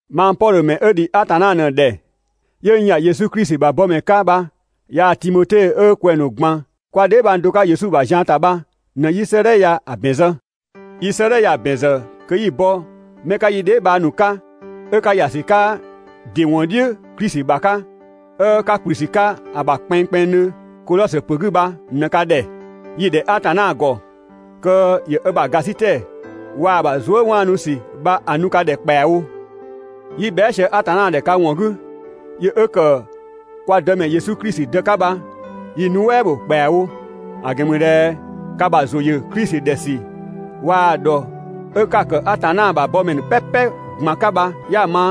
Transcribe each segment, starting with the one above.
Mang Pɔdhö ‑mɛ 'ö ‑dhi Atanna ꞊në‑ ‑dhɛ 'yö n ‑ya Yesu Klisi ‑bha bɔmɛ 'ka bha yaa‑ Timote 'ö kwɛng‑ ‑nu ꞊gban 'kwa dheebhang do 'ka Yesu ‑bha zian ‑ta bha ꞊në 'yi 'sëëdhɛ ya‑ ‑bɛn zë. Yi 'sëëdhɛ ya‑ ‑bɛn ‑zë kö 'yi‑ bɔ 'mɛ 'ka yi dheebhang ‑nu 'ka 'ö 'ka ‑ya ‑sü 'ka ‑dɩ ‑wɔn "dhiʋ̈ Klisi ‑bha 'ka, 'ö 'ka ‑kplü ‑sü 'ka‑ ‑bha kpɛnngkpɛnngdhö Kodhɔsö ‑pö 'gü bha ꞊në‑ ka ‑dhɛ. Yi‑ ‑dhɛ Atanna ‑gɔ kö ‑yö ö ‑bha ‑gasitɛ waa‑ ‑bha zuëwaanusü bha‑ nu ka ‑dhɛ ‑kpɛawo. 'Yi bhɛa" sië Atanna ‑dhɛ ka ‑wɔn 'gü, yö 'ö ‑kë kwa Dëmɛ Yesu Klisi Dë 'ka bha yi‑ nuɛ" bho ‑kpɛawo. ‑A ‑gɛn ‑mü ꞊dhɛ ka ‑bha ‑zʋ ‑yö Yesu Klisi ‑dhɛ ‑sü waa‑ ‑dhɔ 'ö 'ka‑ ‑kë Atanna ‑bha mɛ ‑nu "pɛpɛ ꞊gban 'ka bha 'ya‑ ma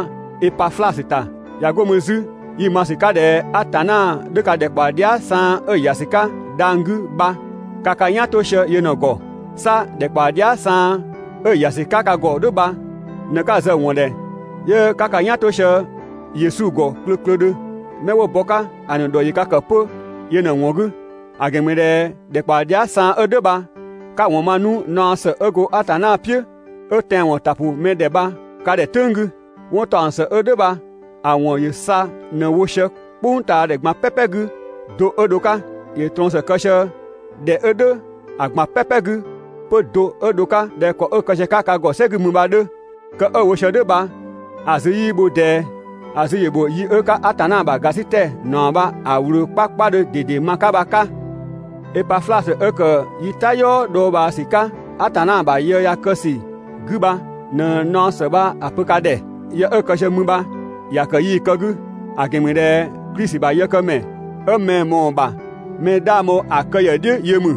(Epaflasö ‑ta). ꞊Ya 'go mü 'zü yi‑ ma ‑sü 'ka ꞊dhɛ Atanna 'dhö ka ‑dhɛkpaɔ dhia" saan 'ö‑ ‑ya ‑sü 'ka dhang‑ 'gü bha, ka ka "yan 'to sië yö ꞊në‑ ‑gɔ. 'Sa ‑dhɛkpaɔ dhia" saan 'ö ‑ya ‑sü 'ka ka ‑gɔ "dhʋ̈ bha ꞊në 'ka zë‑ ‑wɔn ‑dhɛ 'yö 'ka ka "yan 'to sië Yesu ‑gɔ klöklödhö. 'Mɛ 'wo bɔ‑ 'ka ‑a ‑nu ‑dhɔ ‑yö ka ‑kë 'pö yö ꞊në‑ ‑wɔn 'gü. ‑A ‑gɛn ‑mü ꞊dhɛ ‑dhɛkpaɔ dhia" saan 'ö "dhʋ̈ bha 'ka‑ ‑wɔn ma 'nu naɔ ‑së 'ö go Atanna "piʋ̈ 'ö tɛanwɔn ‑ta ‑pʋ mɛ ‑dhɛ bha‑ ‑pö ka ‑dhɛ "tʋ̈ng 'gü. 'Wɔn ‑taɔng ‑së 'ö "dhʋ̈ bha‑ ‑wɔn ‑yö sa ꞊në‑ wo sië "kpʋngtaadhɛ ꞊gban "pɛpɛ 'gü do 'ö dho‑ 'ka. ‑Yö ꞊trɔɔn ‑së kë sië ‑dhɛ 'ö "dhʋ̈ ‑a ꞊gban "pɛpɛ 'gü 'pö do 'ö dho‑ 'ka ꞊dhɛ ‑kɔ 'ö‑ kë sië‑ 'ka ka ‑gɔ "sɛ 'gü mü bha‑ 'dhö. Kë 'ö‑ wo sië "dhʋ̈ bha‑ zü 'yii bho ꞊dɛɛ, ‑a zü‑ ‑bho yi 'ö 'ka Atanna ‑bha ‑gasitɛ ‑naɔ bha‑ ꞊wlöö 'kpakpadhö ꞊dede ma‑ 'ka bha‑ 'ka. Epaflasö 'ö ‑kë yi "tayɔɔ dhɔɔbhaasü 'ka Atanna ‑bha yë ya‑ kë ‑sü 'gü bha ꞊nɛ naɔ ‑së bha‑ pö ka ‑dhɛ. Yë 'ö‑ kë sië mü bha ‑ya ‑kë yii‑ kë 'gü, ‑a ‑gɛn ‑mü ꞊dhɛ Klisi ‑bha yëkëmɛ 'ö mɛ‑ ꞊mɔɔ‑ ‑bha mɛ 'dhang bho‑ kë ‑yë "dhiʋ̈ yö ‑mü.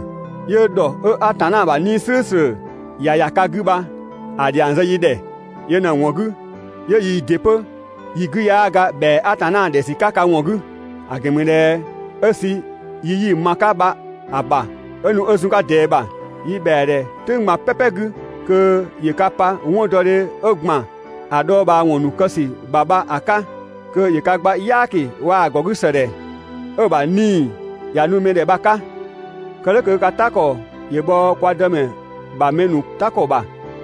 Yö ꞊në nu 'yö ‑dhɔ 'ö Atanna ‑bha 'Nii‑ "slʋ̈ʋ̈slʋ̈ ‑ya ‑ya ka 'gü bha‑ ‑dhiang zë yi ‑dhɛ. Yö ꞊në‑ ‑wɔn 'gü 'yö yii ‑dɩ 'pö yi 'gü 'yaa ga ‑bhɛa Atanna ‑dhɛ ‑sü 'ka ka ‑wɔn 'gü. ‑A ‑gɛn ‑mü ꞊dhɛ 'ö sü yi 'yi‑ ma‑ 'ka bha‑ ‑bha 'ö nu 'ö zun ꞊dɛɛ ‑bha, yi ‑bhɛa ‑dhɛ "tʋ̈ng ꞊gban "pɛpɛ 'gü kö ‑yö ka pa 'wɔndɔdhe 'ö ‑gban ‑a dhɔɔbhaawɔn ‑nu kë ‑sü ‑bha bha‑ 'ka, kö ‑yö ka gba "yaaki waa‑ ‑gɔgüsëdhɛ 'ö‑ ‑bha 'Nii‑ ‑ya nu mɛ ‑dhɛ bha‑ 'ka. Kë "dhʋ̈ kö ka "ta ‑kɔ ‑yö bhɔ kwa Dëmɛ ‑bha mɛ ‑nu "ta ‑kɔ ‑bha,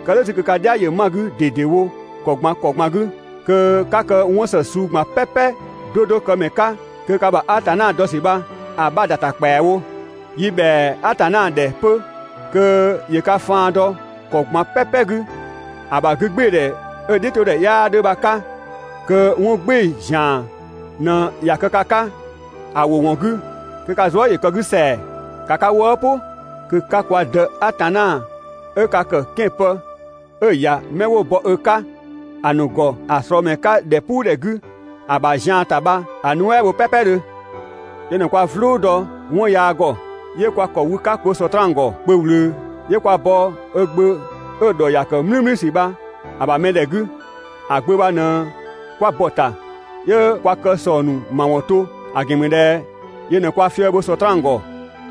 kë "dhʋ̈ 'zü kö ka "dhia ‑yö ma‑ 'gü ꞊dedewo ‑kɔ ꞊gban ‑kɔ ꞊gban 'gü, kö 'ka kë 'wɔn ‑së suu ꞊gban "pɛpɛ 'do 'do këmɛ 'ka kö ka ‑bha Atanna dɔ ‑sü bha‑ 'bha ‑da ‑ta ‑kpɛawo. Yi ‑bhɛa Atanna ‑dhɛ 'pö kö ‑yö ka faan dɔ ‑kɔ ꞊gban "pɛpɛ 'gü ‑a ‑bha 'gügbɩɩdhɛ 'ö‑ "dhiʋ̈todhɛ 'yaa 'dhö bha‑ 'ka, kö 'wɔn "gbɩɩ‑ ‑zian ꞊në ꞊ya kë ka 'ka ‑a ‑wʋ ‑wɔn 'gü, kö ka zuë" ‑yö kë‑ 'gü ‑sɛa. ‑Ka ka wëë' "pʋ kö 'ka kwa Dë Atanna 'ö ka ‑kë 'kɛan‑ pë 'ö‑ ‑ya 'mɛ 'wo bɔ ö 'ka ‑a ‑nu ‑gɔ ‑a ꞊slɔɔ ‑mɛ 'ka ‑dhɛpuudhɛ 'gü ‑a ‑bha zian ‑ta bha‑ nuɛ" bho "pɛpɛdhö. Yö ꞊në kwa "vlʋ dɔ 'wɔn yaa ‑gɔ 'yö kwa ‑kɔ bho Sɔtraan ‑gɔ kpö ꞊wlöö, 'yö kwa bɔ ö Gbö 'ö‑ ‑dhɔ ‑ya ‑kë "mlümlüsü bha‑ ‑bha mɛdhɛ 'gü, ‑A Gbö bha ꞊në 'kwa bɔ‑ ‑ta 'yö kwa kë ‑sɔng ‑nu ‑mawɔn 'to, ‑a ‑gɛn ‑mü ꞊dhɛ yö ꞊nɛ kwa fië bho Sɔtraan ‑gɔ.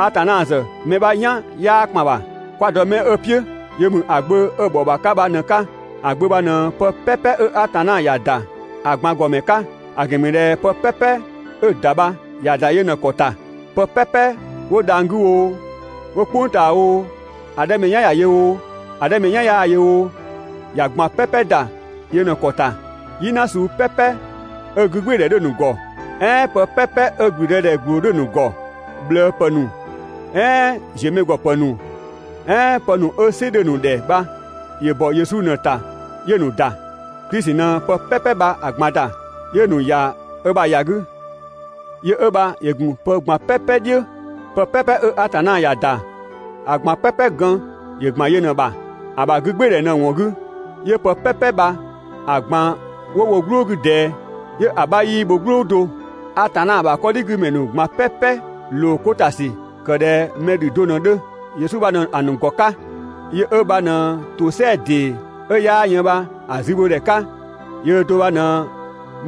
Atanna ‑zë mɛ 'bha "yan 'yaa ‑kpan ‑bha. 'Kwa‑ dɔ 'mɛ 'ö‑ "piʋ̈ yö ‑mü ‑a Gbö 'ö‑ ‑bhɔ ‑bha 'ka bha ꞊në‑ 'ka. ‑A Gbö bha ꞊në pë "pɛpɛ 'ö Atanna ‑ya ‑da ‑a ꞊gban ‑gɔmɛ 'ka. ‑A ‑gɛn ‑mü ꞊dhɛ pë "pɛpɛ 'ö‑ ‑da bha ‑ya ‑da yö ꞊në‑ ‑kɔ ‑ta. Pë "pɛpɛ 'wo dhang‑ 'gü oo, 'wo "kpʋng ꞊taa oo, ‑a 'dhɛ mɛ "yan ‑ya yö oo, ‑a 'dhɛ mɛ "yan 'yaa‑ yö oo, ‑ya ꞊gban "pɛpɛ ‑da yö ꞊në‑ ‑kɔ ‑ta. "Yina suu "pɛpɛ 'ö 'gügbɩɩdhɛ 'dhö‑ ‑nu ‑gɔ, "ɛɛn pë "pɛpɛ 'ö ‑blüdëdhɛ ‑gbloo 'dhö‑ ‑nu ‑gɔ, ꞊bhlëëpë ‑nu "ɛɛn ziömɛgɔpë ‑nu, "ɛɛn pë ‑nu 'ö "sɩ dhö‑ ‑nu ‑dhɛ bha, ‑yö ‑bɔ Yesu ꞊në‑ ‑ta 'yö‑ ‑nu ‑da. Klisi ꞊në pë "pɛpɛ bha‑ ꞊gban ‑da, 'yö‑ ‑nu ‑ya ö ‑bha ‑ya 'gü. Yö 'ö bha ‑yö ‑gun pë ꞊gban "pɛpɛ "dhiʋ̈. Pë "pɛpɛ 'ö Atanna ‑ya ‑da ‑a ꞊gban "pɛpɛ gën ‑yö ‑gban yö ꞊në‑ ‑bha. ‑A ‑bha 'gügbɩɩdhɛ ꞊në‑ ‑wɔn 'gü 'yö pë "pɛpɛ bha‑ ꞊gban 'wo wo "gblʋʋ 'gü ꞊dɛɛ, 'yö‑ 'bha 'yii bho "gblʋʋ do. Atanna ‑bha 'kɔdhigümɛ ‑nu ꞊gban "pɛpɛ ‑lookota ‑sü ‑kë ꞊dhɛ mɛ ‑dhü do ꞊në‑ 'dhö, Yesu bha ꞊në‑ ‑nu ‑gɔ 'ka, yö 'ö bha ꞊në ‑tosɛa ‑dee 'ö 'yaa yën bha‑ zübhodhɛ 'ka, yöö do bha ꞊në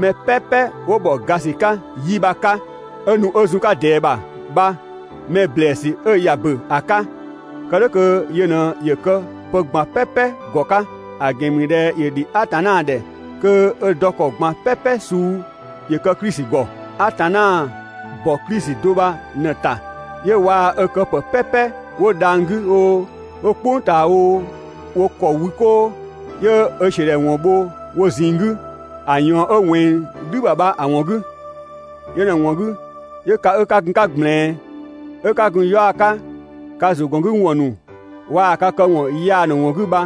mɛ "pɛpɛ 'wo ‑bhɔ ga ‑sü 'ka 'yi bha‑ 'ka 'ö nu 'ö zun‑ 'ka ꞊dɛɛ ‑bha bha‑ mɛ ‑blɛɛsü 'ö ꞊ya ‑bö ‑a 'ka, kë "dhʋ̈ kö yö ꞊në ‑yö kë pë ꞊gban "pɛpɛ ‑gɔ 'ka. ‑A ‑gɛn ‑mü ꞊dhɛ ‑yö ‑dhi Atanna ‑dhɛ kö ö dɔ ‑kɔ ꞊gban "pɛpɛ suu ‑yö kë Klisi ‑gɔ. Atanna ‑bɔ Klisi do bha‑ ꞊në ‑ta 'yö waa ö këpë "pɛpɛ 'wo dhang‑ 'gü oo, 'wo "kpʋng ꞊taa oo, wo ‑kɔ wü 'koo, 'yö ö ‑siödhɛwɔn bho wo ꞊zinng 'gü ‑a ꞊yɔɔn 'ö ꞊wɛnng "dhü ‑bha bha‑ ‑wɔn 'gü. Yö ꞊në‑ ‑wɔn 'gü 'yö ka 'ö 'ka gun‑ 'ka ꞊gblɛɛn, 'ö 'ka gun‑ 'yaɔ‑ 'ka ka ‑zʋgɔngüwɔn ‑nu waa‑ ka këwɔn yaa ‑nu ‑wɔn 'gü bha,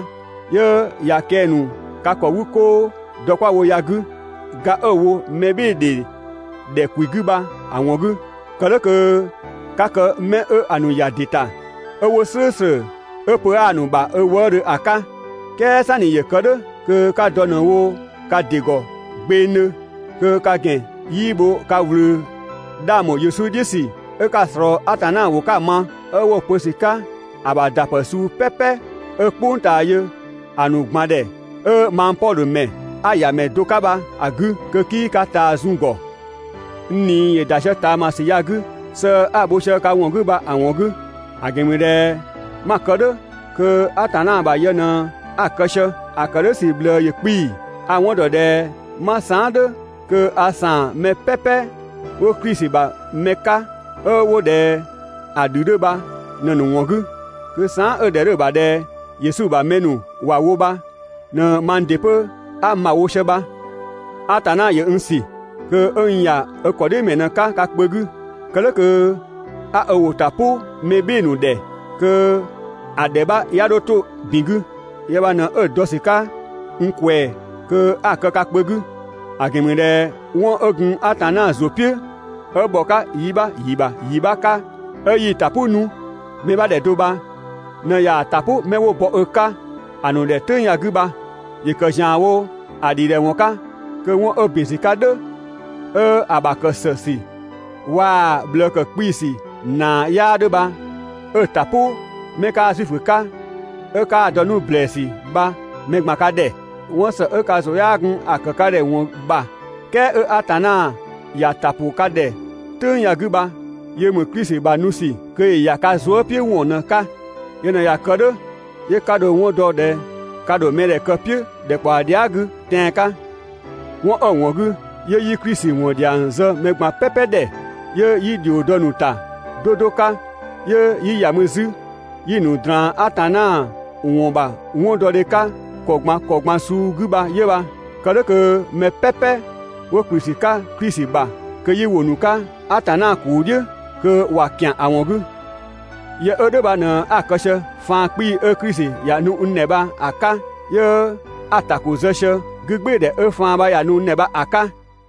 'yö ꞊ya kɛng‑ ‑nu ka ‑kɔ 'wü 'koo dɔ 'kwa‑ wo ya‑ 'gü, ga 'ö‑ wo mɛbhɩɩdhe ‑dhɛ ‑kwi 'gü bha‑ ‑wɔn 'gü. Kë "dhʋ̈ kö 'ka kë 'mɛ 'ö‑ ‑nu ‑ya ‑dɩ ‑ta, 'ö 'wo "slʋ̈ʋ̈slʋ̈, 'ö pö 'aa‑ ‑nu ‑bha ö wëëdhö ‑a 'ka. "Kɛɛ "sanni ‑yö kë "dhʋ̈, kö 'ka dɔ ꞊në wo ka ‑dɩ ‑gɔ gbɛnngdhö, kö ka ‑gɛn 'yii bho ka ꞊wlöö 'dhang ‑bho Yesu "dhiʋ̈ ‑sü 'ö 'ka‑ ꞊slɔɔ Atanna ‑wʋ 'ka‑ ma, 'ö 'wo‑ pö ‑sü 'ka ‑a ‑bha ‑da ‑pë suu "pɛpɛ 'ö "kpʋng ꞊taa yö ‑a ꞊gban ‑dhɛ, 'ö mang Pɔdhö ‑mɛ 'a‑ ‑yamɛ do 'ka bha‑ 'gü, kö 'kii ka ꞊taa zun‑ ‑gɔ. N ꞊nii ‑yö ‑da sië ꞊taamasü ya‑ 'gü sëë 'a‑ bho sië ka ‑wɔn 'gü bha‑ ‑wɔn 'gü. ‑A ‑gɛn ‑mü ꞊dhɛ 'ma‑ kë "dhʋ̈ kö Atanna ‑bha yë ꞊në a‑ kë sië. ‑A ‑kë "dhʋ̈ ‑sü ꞊bhlëë ‑yö 'kpii‑. A‑ 'wɔn ‑dɔ ꞊dhɛ 'ma saan" "dhʋ̈ kö a ‑saan mɛ "pɛpɛ 'wo Klisi ‑bha mɛ 'ka 'ö 'wo ꞊dhɛ‑ ‑dhü 'dhö bha ꞊në‑ ‑nu ‑wɔn 'gü. Kö saan" 'ö‑ ‑dhɛ 'dhö‑ bha ꞊dhɛ Yesu ‑bha mɛ ‑nu ‑wa wo bha ‑në mang ‑dɩ 'pö 'a n ‑bha wo sië bha. Atanna ‑yö n ‑sü kö 'ö n ‑ya ö ‑kɔdhiʋ̈mɛ ꞊në‑ 'ka ka kpö 'gü. Kë "dhʋ̈ kö 'a ö ‑wʋ ‑ta "pʋ mɛ "bhɩɩ‑ ‑nu ‑dhɛ kö ‑a ‑dhɛ 'bha 'ya 'dho 'to ‑bin 'gü. Yë bha ꞊në 'ö‑ dɔ ‑sü 'ka n ꞊kwɛɛ‑ kö 'a‑ kë ka kpö 'gü. ‑A ‑gɛn ‑mü ꞊dhɛ 'wɔn 'ö gun Atanna ‑zʋ "piʋ̈ 'ö ‑bhɔ 'ka yibha ‑yibha ‑yibha 'ka 'ö 'yii‑ ‑ta "pʋ 'nu mɛ 'bha ‑dhɛ do bha ꞊në ꞊yaa‑ ‑ta "pʋ 'mɛ 'wo bɔ ö 'ka ‑a ‑nu ‑dhɛ "tʋ̈ng ya‑ 'gü bha. ‑Yö ‑kë ‑zianwo ‑a ‑dhidhɛwɔn 'ka kö 'ö 'wɔn 'ö ‑bin ‑sü 'ka "dhʋ̈, 'ö‑ ‑bha ‑kë ‑së ‑sü waa‑ ꞊bhlëë ‑kë 'kpii‑ ‑sü ‑naa 'yaa 'dhö bha 'ö‑ ‑ta "pʋ 'mɛ 'kaa Zuifö 'ka, 'ö 'kaa‑ dɔ 'nu ‑blɛɛsü bha mɛ ꞊gban ka ‑dhɛ. 'Wɔn ‑së 'ö ka ‑zʋ 'yaa gun‑ ‑kë ka ‑dhɛ ‑wɔn ‑bha "kɛɛ 'ö Atanna ‑ya ‑ta ‑pʋ ka ꞊dhɛ "tʋ̈ng ya‑ 'gü bha yö ‑mü Klisi ‑bha nu ‑sü kö ‑yö ‑ya ka zuëpiʋ̈wɔn ꞊në‑ 'ka. Yö ꞊në ꞊ya kë "dhʋ̈ 'yö 'ka dho‑ 'wɔn dɔ ꞊dhɛ ka ‑dho mɛdhɛ kë‑ "piʋ̈ ‑dhɛkpaɔ dhia" 'gü tɛan‑ 'ka. 'Wɔn 'ö‑ ‑wɔn 'gü 'yö 'yi Klisi ‑wɔn ‑dhiang zë mɛ ꞊gban "pɛpɛ ‑dhɛ, 'yö 'yi ‑dhio dɔ‑ ‑nu ‑ta 'do 'do 'ka, 'yö 'yi ‑ya mü 'zü 'yi‑ ‑nu ꞊draan Atanna ‑wɔn ‑bha 'wɔndɔdhe 'ka ‑kɔ ꞊gban ‑kɔ ꞊gban suu 'gü bha 'yö bha. Kë "dhʋ̈ kö mɛ "pɛpɛ 'wo ‑kplü ‑sü 'ka Klisi ‑bha kö 'yi ‑wo ‑nu 'ka Atanna ‑kuu "dhiʋ̈ kö ꞊wa ‑kian ‑a ‑wɔn 'gü. Yë 'ö "dhʋ̈ bha ꞊në 'a‑ kë sië faan 'kpii‑ 'ö Klisi ‑ya nu n ‑dhɛ bha‑ 'ka 'yö 'a‑ ‑ta ‑ko zë sië 'gügbɩɩdhɛ 'ö faan bha ‑ya nu n ‑dhɛ bha‑ 'ka.